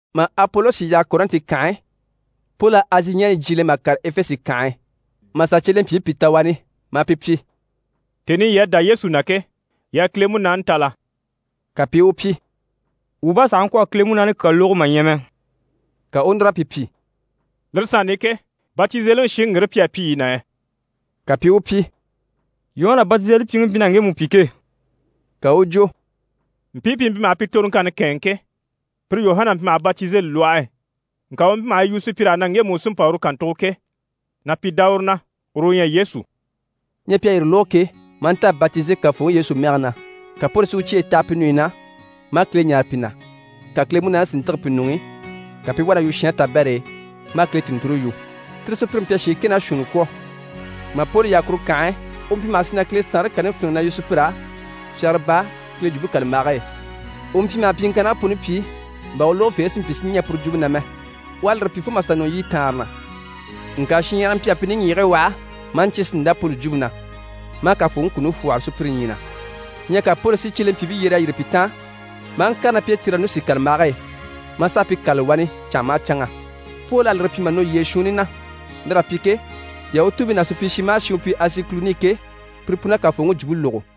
Mà Apolosi yaha Kɔrɛnti kànhe e, Poli à Azi ɲaɲyi jyiile mà kàre Efese kànhe e, mà sà cyelempyiibii pìi ta wani, maa pi pyi: «Tèni i yii à dá Yesu na ke, yii à Kile Munaani ta la?» Ka pi i u pyi: «Wuu bá sàha ŋkwɔ̀ a Kile Munaani kyaa lógo mà ɲya mɛ.» Ka u u núr'a pi pyi: «Lire sanni i ke, batizeliŋi shiŋi ŋgire pi à pyi yii na yɛ?» Ka pi i u pyi: «Yuhana Batizelipyiŋi mpyi na ŋgemu pyi ke.» Ka u u jwo: «Mpii pi mpyi maha pi toroŋkanni kɛ̂ɛnŋɛ ke, pire Yuhana mpyi maha batizeli lwɔhe e. Ŋka u mpyi maha yi yu sùpyir'á na ŋgemu u sí n‑pa uru kàntugo ke, na pi dá uru na, uru u ɲyɛ Yesu.» Ɲyɛ pi à yire lógo ke, maa nta a batize Kafooŋi Yesu mɛge na. Ka Poli si u cyeyi taha pi ɲùɲyi na, maa Kile ɲáare pi na, ka Kile Munaani si ntîge pi ɲuŋ'i, ka pi i wá na yu shɛɛnre tabɛr'e, maa Kile tùnnture yu. Tire sùpyire mpyi a shiin kɛ ná shuunni kwɔ̀. Mà Poli yaha kuru kànhe e, u mpyi maha sì na Kile Saanre kani fíniŋi na yu sùpyir'á fyagara baa Kile Jwumpe kàlambage e. U mpyi maha pyiŋkannigii puni pyi bà u lógofeebii si mpyi si ɲɛɛ puru jwumpe na mɛ. U à lire pyi fo mà sà nɔ yiɲyɛ taanre na. Ŋka shinɲyahara mpyi a pi niŋgyigigii waha, maa ɲcyé si ndá Poli jwumpe na, maa Kafooŋi kuni fwɔ́hɔre sùpyire ɲyii na. Ɲyɛ ka Poli si cyelempyiibii yyer'a yîri pi taan, maa ŋkàre ná pi e Tiranusi kàlambage e, maa sà a pi kâlali wani canŋa maha canŋa. Poli à lire pyi mà nɔ yyee shuunni na. Lir'à pyi ke, Yahutuubii ná supyishi maha shi u mpyi Azi kùluni i ke, pire pun'à Kafooŋi jwumpe lógo.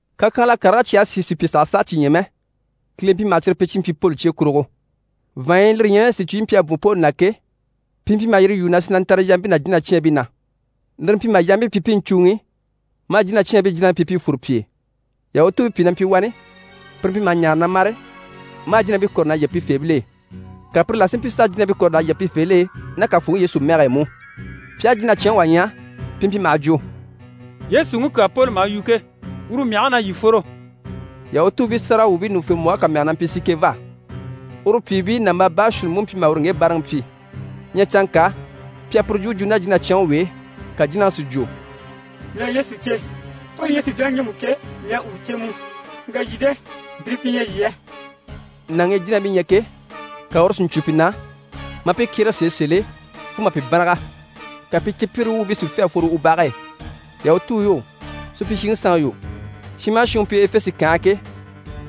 Kakyanhala karigii cyi à sìi sùpya sàha sàa cyi ɲya mɛ, Kile mpyi maha cyire pyi Poli cye kurugo. Vàanɲyi, lire ɲyɛ mɛ sìcuyi yi mpyi a bwɔ̀n Poli na ke, pi mpyi maha yire lwúu maha sì na ntare yampii ná jínacyaanbii na. Lire mpyi maha yampii pyi pi i ɲcùuŋi, maa jínacyaanbii jínabii pyi pi i fwore pi e. Yahutuubii pìi na mpyi wani, pire mpyi maha ɲaare na mâre, marii jínabii kɔ̀re na yige pifeebil'e. Ka pire la si mpyi s'a jínabii kɔ̀re s'a yige pifeebil'e ná Kafooŋi Yesu mɛge e mú. Pi aha jínacyanŋi wà ɲya, pi mpyi maha jwo: «Yesuŋi kyaa Poli maha yu ke, uru mɛge na, yii fworo!» Yahutuubii sáragawwuubii ɲùŋufembwɔhe kà mɛge na mpyi Sikɛva. Uru pyìibii nàmbaa baashuunni mú mpyi maha uru ŋge báaraŋi pyi. Ɲyɛ canŋka, pi à puru jwumpe jwo ná jínacyanŋi w'e, ka jínaŋi si jwo: «Mii à Yesu cè, Poli ɲyɛ sùpyaŋi ŋgemu ke, mii à uru cè mú, ŋka yii de? Mpire pi ɲyɛ yii yɛ?» Nàŋi i jínabii ɲyɛ ke, ka uru si ɲcwo pi na, maa pi kyérege sèe sèl'e fo mà pi bânnaga, ka pi cípyire wuubii si fê a fworo u bage e. Yahutuu yo, supyishiŋi sanŋi yo, shin maha shin u mpyi Efese kànhe e ke,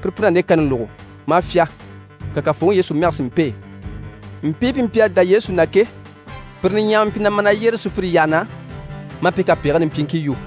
pire pun'à nde kani lógo maa fyá. Ka Kafooŋi Yesu mɛge sí n‑pêe. Mpii pi mpyi a dá Yesu na ke, pire niɲyahamii mpyi na ma na yyéreli sùpyire yyaha na, maa pi kapegigii nimpyiiŋkii yu.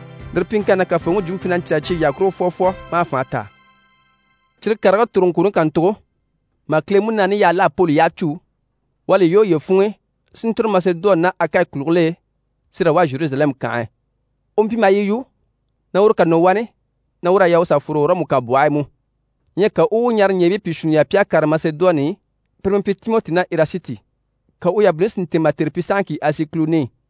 Lire pyiŋkanni na, Kafooŋi jwumpe mpyi na ɲcaali cyeyi yyaha kurugo fwɔfwɔ maa fànha taa. Cyire karigii toroŋkwooni kàntugo, mà Kile Munaani yaha l'à Poli yyaha cû, u à li lwɔ́ uye funŋ'i si ntòro Masedoni ná Akayi kùligil'e si raa wá Zheruzalɛmu kànhe e. U mpyi maha yi yu na uru ká nɔ wani, na ur'à yaa u sà fworo Ɔrɔmu kànbwɔhe e mú. Ɲyɛ ka u u u ɲaaraɲɛɛbii pìi shuunni yaha pi à kàre Masedoni i, pire pi mpyi Timɔti ná Erasiti. Ka u yabiliŋi si ntɛ̀ɛn mà tère pyi sahaŋki Azi kùluni i.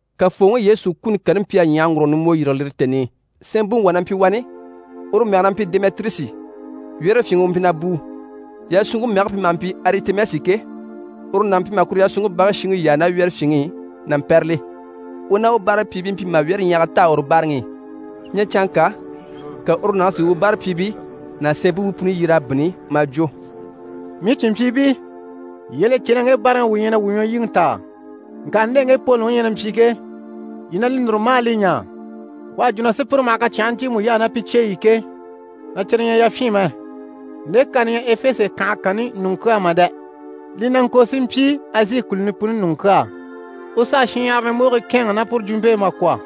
Kafooŋi Yesu kuni kani mpyi a ɲyàhaŋgurugo nimbwo yîrige lire tèni i. Sɛɛnbuŋi wà na mpyi wani, uru mɛge na mpyi Demɛtirusi, wyɛ́rɛfyinŋi u mpyi na bùu. Yasunŋke mɛge pi maha mpyi Aritɛmisi ke, uru nàŋi mpyi maha kuru yasunŋke bage shiŋi yaa ná wyɛ́rɛfyinŋi i na mpɛ́rɛli. U ná u báarapyiibii mpyi maha wyɛ́rɛɲyahaga taa uru báaraŋi i. Ɲyɛ canŋka, ka uru nàŋi si u báarapyiibii ná sɛɛnbuubii puni yyer'a bínni maa jwo: «Mii cìnmpyiibii, yii à li cè na ŋge báaraŋi i wuu ɲyɛ na wuu ɲwɔlyiŋi taa. Ŋka nde ŋge Poliŋi ɲyɛ na mpyi ke, yii na li núru maa li ɲaa. U à jwo na sùpyire maha kacyanhigii ɲcyiimu yaa ná pi cyeyi i ke, na cyire ɲyɛ yafyin mɛ. Nde kani ɲyɛ Efese kànhe kanni ɲùŋɔ kyaa mà dɛ, li na ŋko si mpyi Azi kùluni puni ɲùŋɔ kyaa. U s'à shinɲyahara ɲùmbogii kɛ̂ɛnŋɛ ná puru jwumpe e mà kwɔ̀.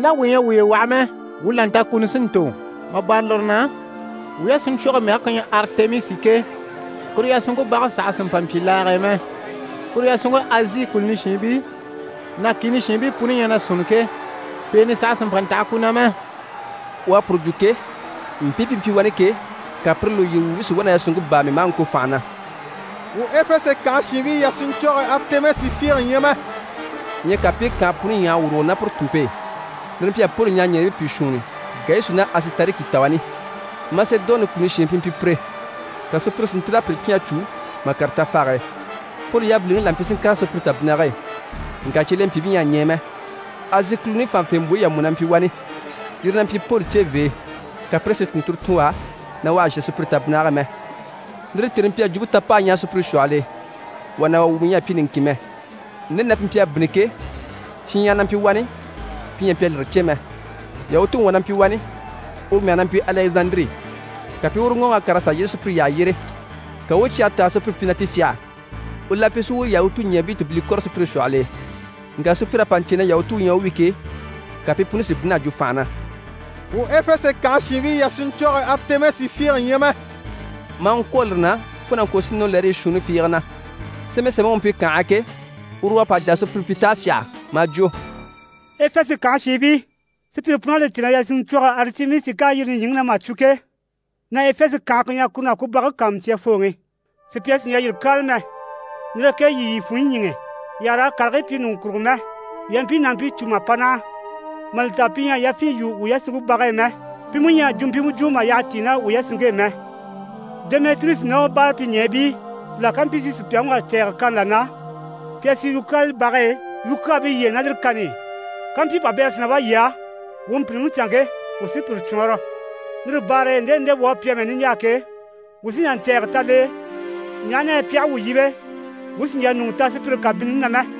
Ná wuu ɲyɛ a wuye waha mɛ, wuu là nta kuni sí n‑tò, mà bâra lire na, wuu yasunɲcwɔge mɛge ku ɲyɛ Aritɛmisi ke, kuru yasunŋke bage saha sì n‑pa n‑pyi laage e mɛ. Kuru yasunŋke Azi kùluni shiinbii ná kìni shiinbii puni ɲyɛ na sunni ke, pèenɛ saha sì n‑pa n‑taha ku na mɛ.» U à puru jwo ke, mpii pi mpyi wani ke, ka pire lùyiri wuubii si wá na yasunŋke báami maa ŋko fànha na: «Wuu Efese kànhe shiinbii yasunɲcwɔge Aritɛmisi fiige ɲyɛ mɛ!» Ɲyɛ ka pi i kànhe puni ɲyàha a wùrugo ná puru tùnmpe e. Lire mpyi a Poli ɲaaraɲɛɛbii pìi shuunni, Gayusi ná Asitariki ta wani. Masedoni kùluni shiin pi mpyi pire, ka sùpyire si ntíl'a pire cyán a cû mà kàre tafage e. Poli yabiliŋi la mpyi si ŋkàre sùpyire tabinnige e, ŋka cyelempyiibii ɲyɛ a ɲɛɛ mɛ. Azi kùluni fànhafembwoyi yà mú na mpyi wani, yire na mpyi Poli cevee, ka pire si tùnnturo tun u á, na u àha zhà sùpyire tabinnige e mɛ. Lire tèni mpyi a jwumpe ta p'a ɲyaha sùpyire shwɔhɔl'e, wà ná wà wumɔ ɲyɛ a mpyi niŋkin mɛ. Nde na pi mpyi a bínni ke, shinɲyahara na mpyi wani, pi ɲyɛ a mpyi a lire cè mɛ. Yahutuŋi wà na mpyi wani, uru mɛge na mpyi Alɛzandiri. Ka pi i uru ŋɔɔŋ'a kàr'a sà yyéeŋɛ sùpyire yyaha yyére. Ka u u cyɛge tɛ̀g'a sùpyire pyi na ti fyâha. U la mpyi si u Yahutuɲɛɛbii tùbile kɔ̀rɔ sùpyire shwɔhɔl'e. Ŋka sùpyir'à pa ɲcè na Yahutu u ɲyɛ u wi ke, ka pi puni si bínn'a jwo fànha na: «Wuu Efese kànha shiinbii yasunɲcwɔge Aritɛmisi fiige ɲyɛ mɛ!» Maa ŋkwôro lire na fo na ŋko si nɔ lɛrii shuunni fiige na. Sémɛsemɛŋi u mpyi kànhe e ke, uru u à pa jà a sùpyire pyi t'à fyâha, maa jwo: «Efese kànhe shiinbii, sùpyire pun'à li cè na yasunɲcwɔge Aritɛmisi k'à yîri nìɲyiŋi na mà cwo ke, na Efese kànhe ku ɲyɛ kuru ná ku bage kàanmucyafooŋi. Sùpya sì n‑jà yire kyáala mɛ. Lire e ke yii yii funɲyi ɲíŋɛ, yii àha raa karigii pyi ɲùŋɔ kurugo mɛ. Yii à mpii nàmpii cû mà pa naha, mà li ta pi ɲyɛ a yafyin yû yasunŋke bage e mɛ, pi mú ɲyɛ a jwumpimɛ jwo mà yyaha tíi ná wuu yasunŋke e mɛ. Demɛtirusi ná u báarapyiɲɛɛbii la ká mpyi si sùpyaŋi wà cɛ̂ɛgɛ kani là na, pi a sì yukyaala bage e yukyaabii yyére ná lire kani i. Kampyi pabɛrɛ sí na wá yii á, wuu mpìnniŋi canŋke, wuu sí puru cwɔɔnrɔ. Lire baare e nde li nde wuu à pyi amɛ niɲjaa ke, wuu sí n‑jà ɲcɛ̀ɛgɛ ta l'e, ɲaha na yɛ pi aha wuu yíbe, wuu sì n‑jà ɲùŋɔ ta sùpyire kabinnini na mɛ.»